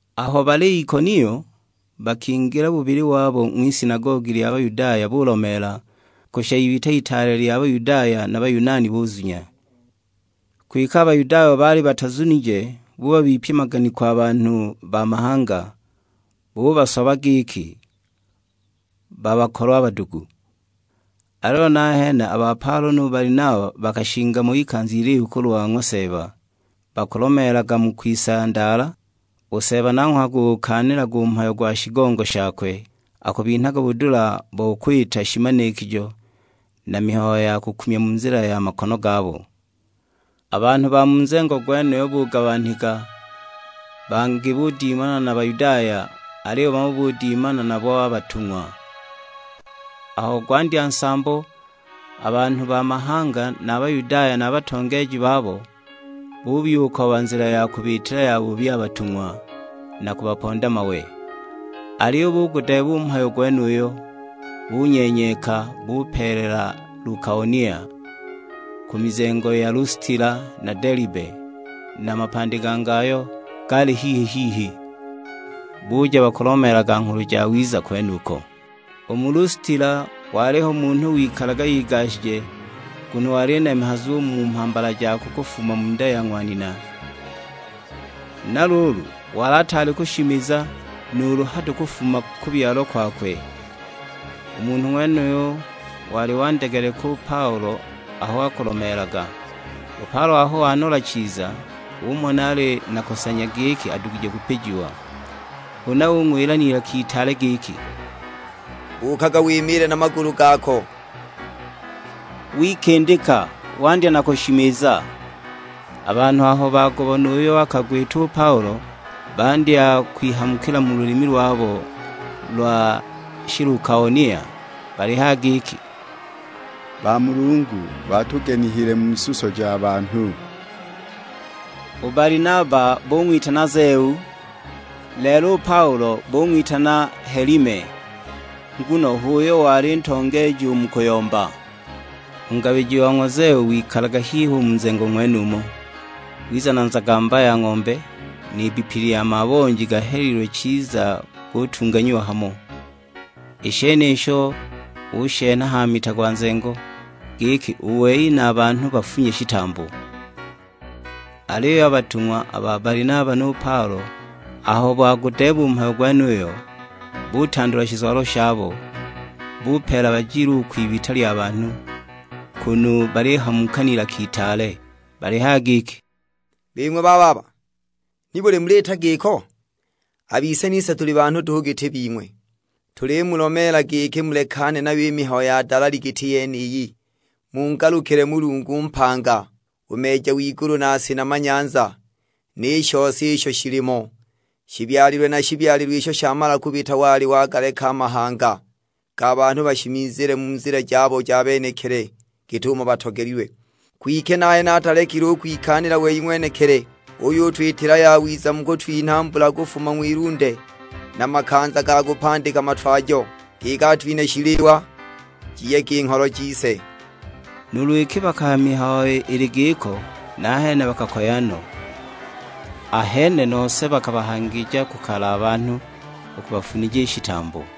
Aho bali Ikonio, bakingila bubili wabo ng'wisinagogi lya Bayudaya bulomeela, kushisha ibita itaale lya Bayudaya na Bayunani buzunya. Kwike a Bayudaya abo baali batazunije bubabipya maganiko a banhu ba mahanga, bubasoba giki babakolwe a badugu. Aliyo nahene a ba Paulo nu Balinaba bakashinga mo ikanza ilihu kulwa ng'wa Seeba, bakulomeelaga mu kwisandaala, u Seeba nanghwe akugukaanilaga u mhayo gwa shigongo shakwe; akubinhaga budula bo kwita shimanikijo na mihayo ya kukumya mu nzila ya makono gabo. A banhu ba mu nzengo gwenuyo bugabanika, bangi budimana na Bayudaya, aliyo bamo budimana nabo a batung'wa. Aho gwandya nsambo, a banhu ba mahanga na a Bayudaya na a batongeeji babo, buyukooba nzila ya kubiitila yabubi a batung'wa, na kubaponda mawe. Aliyo bugudeeba u mhayo gwenuyo; bunyenyeka, bupeelela Lukaonia, ku mizengo ya Lustila na Delibe, na mapandi gangi ayo gaali hihi-hihi; buja bakulomeelaga Nghulu Jawiza kwenuko. U mu Lustila waliho munhu wikalaga igashije, nguno wali nemehazu u mu mhambala jakwe kufuma mu nda ya ng'wa nina, na luulu wali ataali kushimiza nuulu hado kufuma kubyalwa kwakwe. U munhu ng'wenuyo wali wandegeleka u Paulo aho akulomeelaga; u Paulo aho wanola chiza, umona ali na kusanya giki adugije kupijiwa. Huna ung'wila n'ilaka itaale giki, "Buukaga wimiile na magulu gako!" Wikindika, wandya na kushimiza. A banhu aho bagubona uyo akagwita u Paulo, bandya kwihamukila mu lulimi lwabo lwa Shilukaonia; balihaya giki, "Bamulungu batugenihile mu suso ja banhu!" U Balinaba bung'witana Zeu, lelo u Paulo bung'witana Helime, nguno h'uyo wali ntongeeji u mu kuyomba. U ngabiji wa ng'wa Zeu wikalaga hihi u mu nzengo ng'wenumo, wiza na nzagamba ya ng'ombe, n'ibbipi lya mabonji gahelilwe chiza gutunganyiwa hamo; i shenisho ushenha ha mita gwa nzengo, giki u wei na a banhu bafunye shitambo. Aliyo a batung'wa, a ba Balinaba nu Paulo aho bagudeeba u mhayo gwenuyo, butandula shizwalo shabo; bupeela bajile u kwibita lya banhu, kunu balihamuka n'ilaka itaale balihaya giki, "Bing'we bababa, nibuli muliita giko? A bise nise tuli banhu duhu giti bing'we. Tulimulomeela giki mulekane nayo i mihayo ya dalali giti yeniyi, mungalukile Mulungu mpanga, u Meeja w'igulu na si na manyanza, ni shose isho shilimo! Shibyalilwe na shibyalilwe isho shamala kubita wali wagaleka a mahanga ga banhu bashimizile mu nzila jabo ja benekili git'umo batogelilwe. Kwike nahene atalekile u kwikaanila wei ng'wenekili, uyutwitila yawiza mu kutwinha mbula kufuma ng'wilunde, na makanza ga kupandika matwajo; giki atwinhe shiliwa, jiyege i ngholo jise!" Nuulu iki bakahaya mihayo ili giko, nahene bakakoya no; ahene nose bakabahangija ku kale a banhu u kubafunija i shitambo.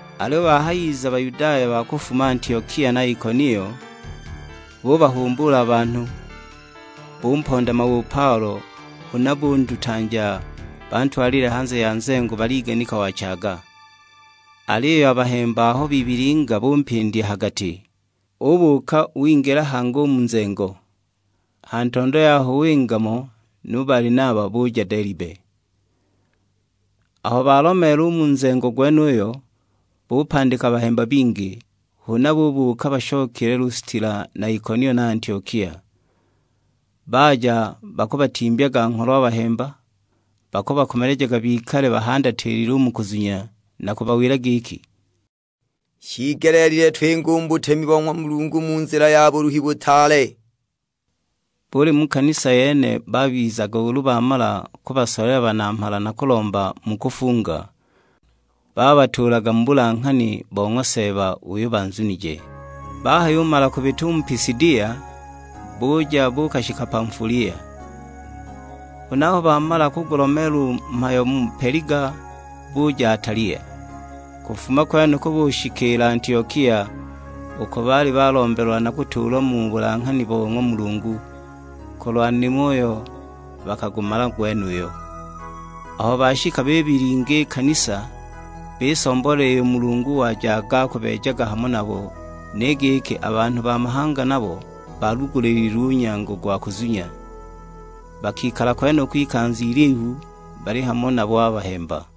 Aliyo bahayiza Bayudaya ba kufuma Antiokia na Ikonio, bubahumbuula a banhu, bumponda mawe u Paulo; huna bundutanja bantwalile hanze ya nzengo baliganika wachaaga! Aliyo a bahemba aho bibilinga bumpindya ha gati, ubuuka wingila hangi u mu nzengo. Ha ntondo yaho winga mo nu Balinaba, buja Delibe. Aho balomeela u mu nzengo gwenuyo, bupandika bahemba bingi, huna bubuuka bashokile Lustila na Ikonio na Antiokia. Baja bakubatimbyaga ngholo a bahemba, bakubakomelejaga bikale bahandatilile u mu kuzunya; na kubawila giki, "Shiigelile twingile u mu butemi bo ng'wa Mulungu mu nzila ya buluhi butaale." Buli mu kanisa yene babizaga ulu bamala kubasolela banamhala na kulomba mu kufunga, babatuulaga mu bulanghani bo ng'wa Seeba uyo banzunije. Bahayumala kubita u mu Pisidia, buja buukashika Pamfulia. Huna aho bamala kugulomeela u mhayo mu Peliga buja Atalia. Kufuma kwenuko bushikiila Antiokia, uko baali balombelwa na kutuulwa mu bulanghani bo ng'wa Mulungu, kulwa nimo uyo bakagumala gwenuyo. Aho bashika bibilinga i kanisa, bisomboolela iyo Mulungu wajaga akubeejaga hamo nabo, ni giki a banhu ba mahanga nabo baalugulililwe u nyango gwa kuzunya. Bakikala kwenuko ikanza ilihu bali hamo nabo a bahemba.